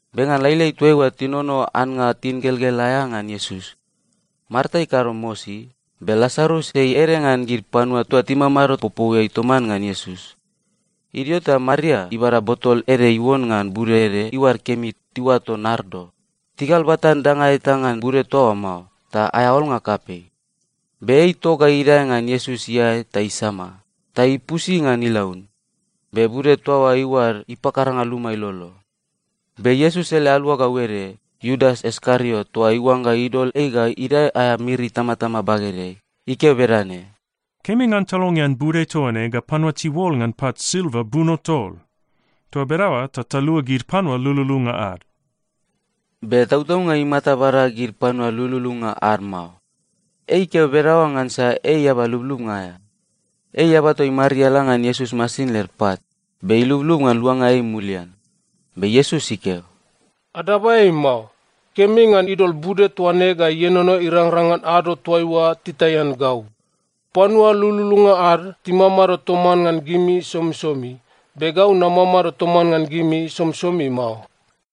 Be ngan lailai toaiua tinono annga tingelgel aea ngan Iesus. Marta ikado mosi, be Lasarus ei ede ngan gid panua toa timamado popouiai toman ngan Iesus. Idio ta Maria ibada botol ede iuon ngan bude ede iuad kemi tiuato nardo. Tigalbatan danga eta ngan bude toa oa mao, ta aea olnga kapei. Be ei itok ga idae ngan Iesus iae ta isama, ta ipusi ngan ilaun. Be bude toa oa iuad ipakaranga luma ilolo. Be Iesus ele aluagau ede, Iudas Iskariot toa iuangga idol ei ga idae aea miri itamatama bagedeai, ikeo bedane, “Kemi ngan talongean bude toa ne ga panua tiuol ngan pat silva buno tol! Toa bedaoa ta talua gid panua lululunga ad.” Be tautaunga imata bada gid panua lululunga ad mao. Ei ikeo bedaoa ngansa ei eaba lublubnga aea. Ei eaba toa imariala ngan Iesus masin led pat, be ilublub ngan luanga ei mulian. Be Iesus ikeo, “Adaba ei mao. Kemi ngan idol bude toa ne ga ienono irangrang ngan ado toaiua titaian gau. Panua lululunga ad timamado toman ngan gimi somisomi, be gau namamado toman ngan gimi somisomi mao.”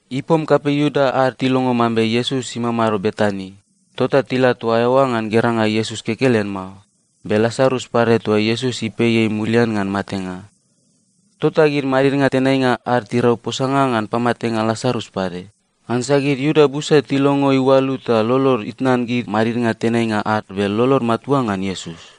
Ipom kapei Iuda ad tilongo mambe Iesus imamado Betani, tota tila toa eoa ngan geranga Iesus kekelen mao, be Lasarus pade toa Iesus ipei ei mulian ngan matenga. Tota gid madidnga tenainga ad tirau posanga ngan pamatenga Lasarus pade, ngansa gid Iuda busa tilongo iualu ta lolod itnan gid madidnga tenainga ad be lolod matua ngan Iesus.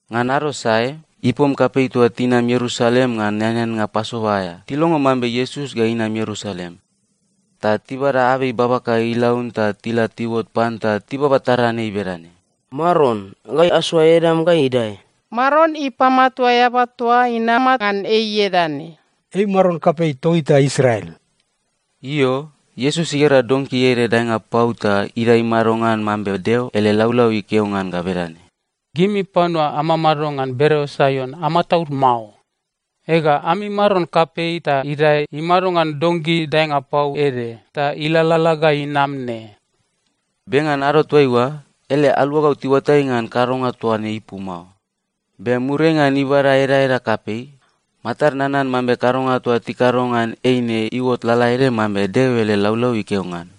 Ngan ado sae, ipom kapei toa tinam Ierusalem ngan eaneannga Pasova aea, tilongo mambe Iesus ga inam Ierusalem. Ta tibada abei babaka ilaun ta tila tiuot pan ta tibaba taran ei bedane, “Maron, gai asoa edam ga idae!” “Maron ipamatua eaba toa inama ngan ei ieda ne!” “Ei Maron kapei togita Israel!” Io, Iesus igera donki ede daenga pau ta idae imado ngan mambe Deo ele laulau ikeo ngan ga bedane, “Gimi panua amamado ngan bereo Saion, amataud mao. Ega, ami maron kapei ta idae imado ngan donki daenga pau ede ta ilalala ga inam ne.” Be ngan ado toaiua, ele aluagau tiuatai ngan kadonga toa ne ipu mao. Be muriai ngan ibada edaeda kapei, matad nanan mambe kadonga toa tikado ngan ei ne iuot lalaede mambe Deo ele laulau ikeo ngan.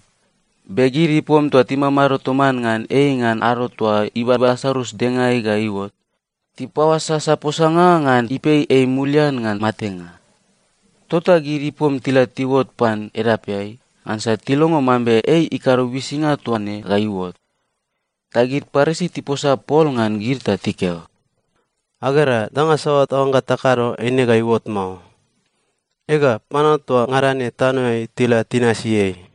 Be gid ipom toa timamado toman ngan ei ngan ado toa ibaba Lasarus dengaeai ga iuot, tipaoasasa posanga ngan ipei ei mulian ngan matenga. Tota gid ipom tila tiuot pan edapeai, ngansa tilongo mambe ei ikado uisinga toa ne ga iuot. Ta gid Parisi tiposa pol ngan gid ta tikeo, “Agera, danga saoa taoangga takado, eine ga iuot mao. Ega, panua toa ngada ne tanoeai tila tinasi ei!”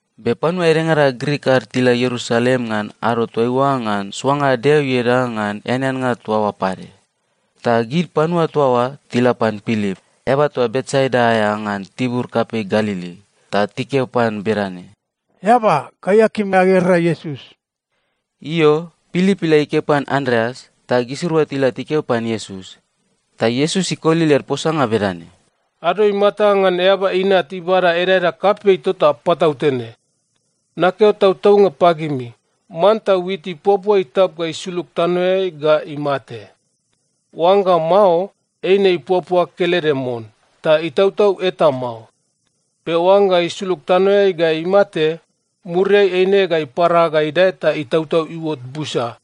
Be panua edengada Grik ad tila Ierusalem ngan ado toaiua ngan soanga Deo ieda ngan eaneannga toa oa pade. Ta gid panua toa oa tila pan Pilip, eaba toa Betsaida aea ngan tibur kapei Galili, ta tikeo pan bedane, “Eaba, gai akim agera Iesus.” Io, Pilip ila ikeo pan Andreas, ta gisirua tila tikeo pan Iesus. Ta Iesus ikoli led posanga bedane, “Ado imata ngan Eaba Inat ibada edaeda kapei tota patautene. Nakeo tautaunga pagimi, manta wit ipuapua itap ga isulug tanoeai ga imate. Oangga mao, eine ipuapua kelede mon, ta itautau eta mao. Be oangga isulug tanoeai ga imate, muriai eine ga ipara ga idae ta itautau iuot busa.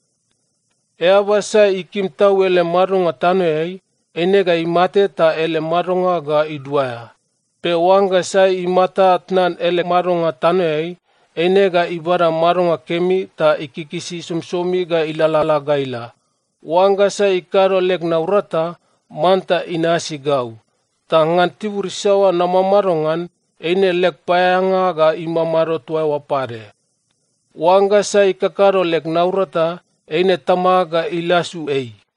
Eaba sai ikim tau ele madonga tanoeai, eine ga imate ta ele madonga ga iduaea. Be oangga sai imata tnan ele madonga tanoeai, eine ga ibada madonga kemi ta ikikisi somisomi ga ilalala ga ila. Oangga sai ikado leg naurata, manta inasi gau. Ta ngan tibur isaoa namamado ngan, eine leg paeaeanga ga imamado toa eoa pade. Oangga sai ikakado leg naurata, eine Tamag ga ilasu ei.”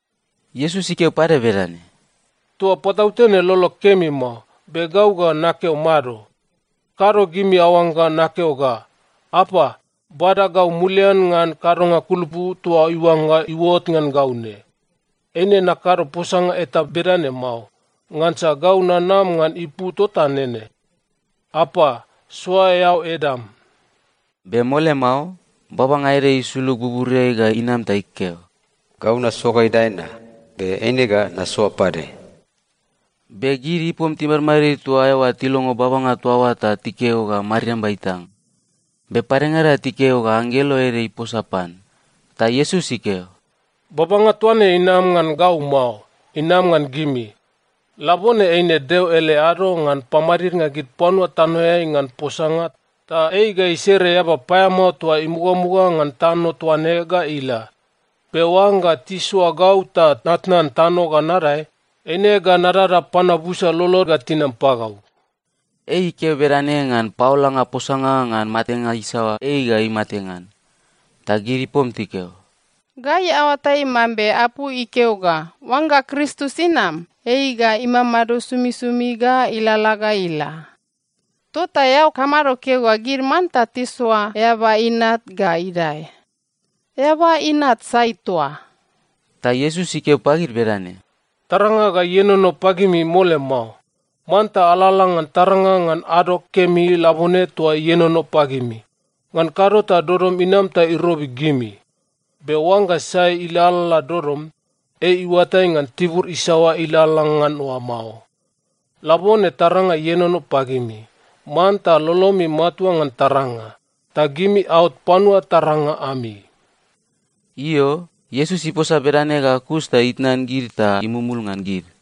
Iesus ikeo pade bedane, “Toa patautene lolog kemi mao, be gau ga nakeo mado? Kado gimi aoangga nakeo ga, ‘Apa, bada gau mulian ngan kadonga kulupu toa iuangga iuot ngan gau ne.’ Eine nakado posanga eta bedane mao, ngansa gau nanam ngan ipu tota nene. Apa, soa eao edam!” Be mole mao, babanga ede isulug buburiai ga inam ta ikeo, “Gau nasoa ga idae na, be eine ga nasoa pade.” Be gid ipom timadmadid toa eoa tilongo babanga toa oa ta tikeo ga mariamba itang. Be padengada tikeo ga anggelo ede iposa pan. Ta Iesus ikeo, “Babanga toa ne inam ngan gau mao, inam ngan gimi. Labone eine Deo ele ado ngan pamadidnga gid panua tanoeai ngan posanga, ta ei ga isere eaba paeamao toa imugamuga ngan tano toa ne ga ila. Be oangga tisoa gau ta natnan tano ga nadae, eine ga nadada panua busa lolod ga tinam pagau.” Ei ikeo bedane ngan paolanga posanga ngan matenga isaoa ei ga imate ngan. Ta gid ipom tikeo, “Gai aoatai mambe apu ikeo ga oangga Kristus inam, ei ga imamado somisomi ga ilalala ga ila. Tota eao kamado keo ga gid manta tisoa Eaba Inat ga idae? Eaba Inat sai toa?” Ta Iesus ikeo pagid bedane, “Taranga ga ienono pagimi mole mao. Manta alalala ngan taranga ngan ado kemi labone toa ienono pagimi. Ngan kado ta dodom inam ta irobi gimi. Be oangga sai ilalala dodom, ei iuatai ngan tibur isaoa ilalala ngan oa mao. Labone taranga ienono pagimi. Manta lolomi matua ngan taranga, ta gimi aot panua taranga ami.” Io, Iesus iposa bedane ga kus ta itnan gid ta imumul ngan gid.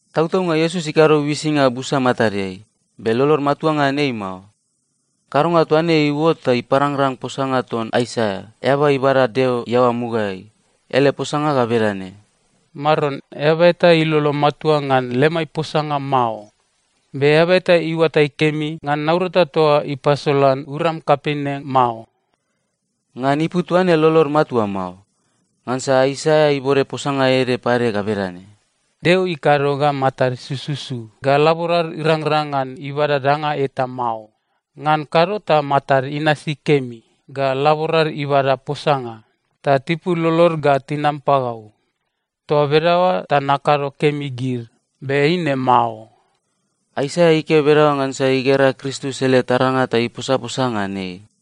Tautaunga Iesus ikado uisinga busa matadeai, be lolod matua ngan ei mao. Kadonga toa ne iuot ta iparangrang posanga ton Aisaia, eaba ibada Deo iaoa mugaeai. Ele posanga ga bedane, “Maron, eaba eta ilolo matua ngan lemai posanga mao! Be eaba eta iuatai kemi ngan naurata toa ipasolan uram kapei ne mao.” Ngan ipu toaine lolod matua mao. Ngansa Aisaia ibode posanga ede pade ga bedane, “Deo ikado ga matad sususu ga laborad irangrang ngan ibada danga eta mao. Ngan kado ta matad inasi kemi, ga laborad ibada posanga, ta tipul lolod ga tinam pagau. Toa bedaoa ta nakado kemi gid. Be eine mao.” Aisaia ikeo bedaoa ngansa igera Kristus ele taranga ta iposaposa ngan ei.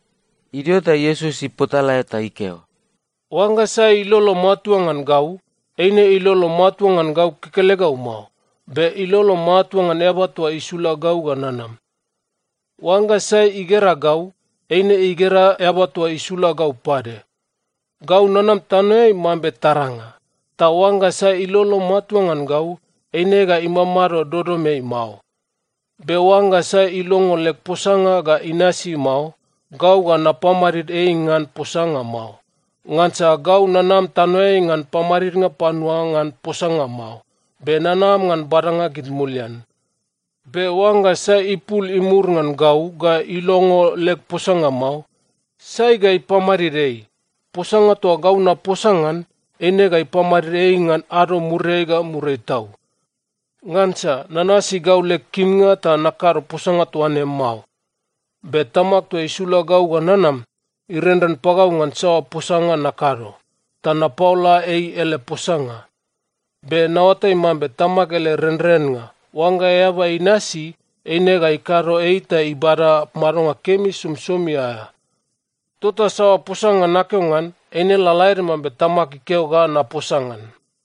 Idio ta Iesus ipotalae ta ikeo, “Oangga sai ilolo matua ngan gau, eine ilolo matua ngan gau kekelegau mao, be ilolo matua ngan Eaba toa isula gau ga nanam. Oangga sai igera gau, eine igera Eaba toa isula gau pade. Gau nanam tanoeai mambe taranga, ta oangga sai ilolo matua ngan gau, eine ga imamado dodomeai mao. “Be oangga sai ilongo leg posanga ga inasi mao, gau ga napamadid ei ngan posanga mao. Ngansa gau nanam tanoeai ngan pamadidnga panua ngan posanga mao. Be nanam ngan badanga gid mulian. Be oangga sai ipul imur ngan gau ga ilongo leg posanga mao, sai ga ipamadid ei? Posanga toa gau naposa ngan, eine ga ipamadid ei ngan ado muriai ga muriai tau. Ngansa nanasi gau leg kimnga ta nakado posanga toa ne mao, be Tamag toa isula gau ga nanam, irenren pagau ngan saoa posanga nakado, ta napaola ei ele posanga. Be naoatai mambe Tamag ele renrennga, oangga eaba inasi, eine ga ikado ei ta ibada madonga kemi somisomi aea. Tota saoa posanga nakeo ngan, eine lalaede mambe Tamag ikeo ga naposa ngan.”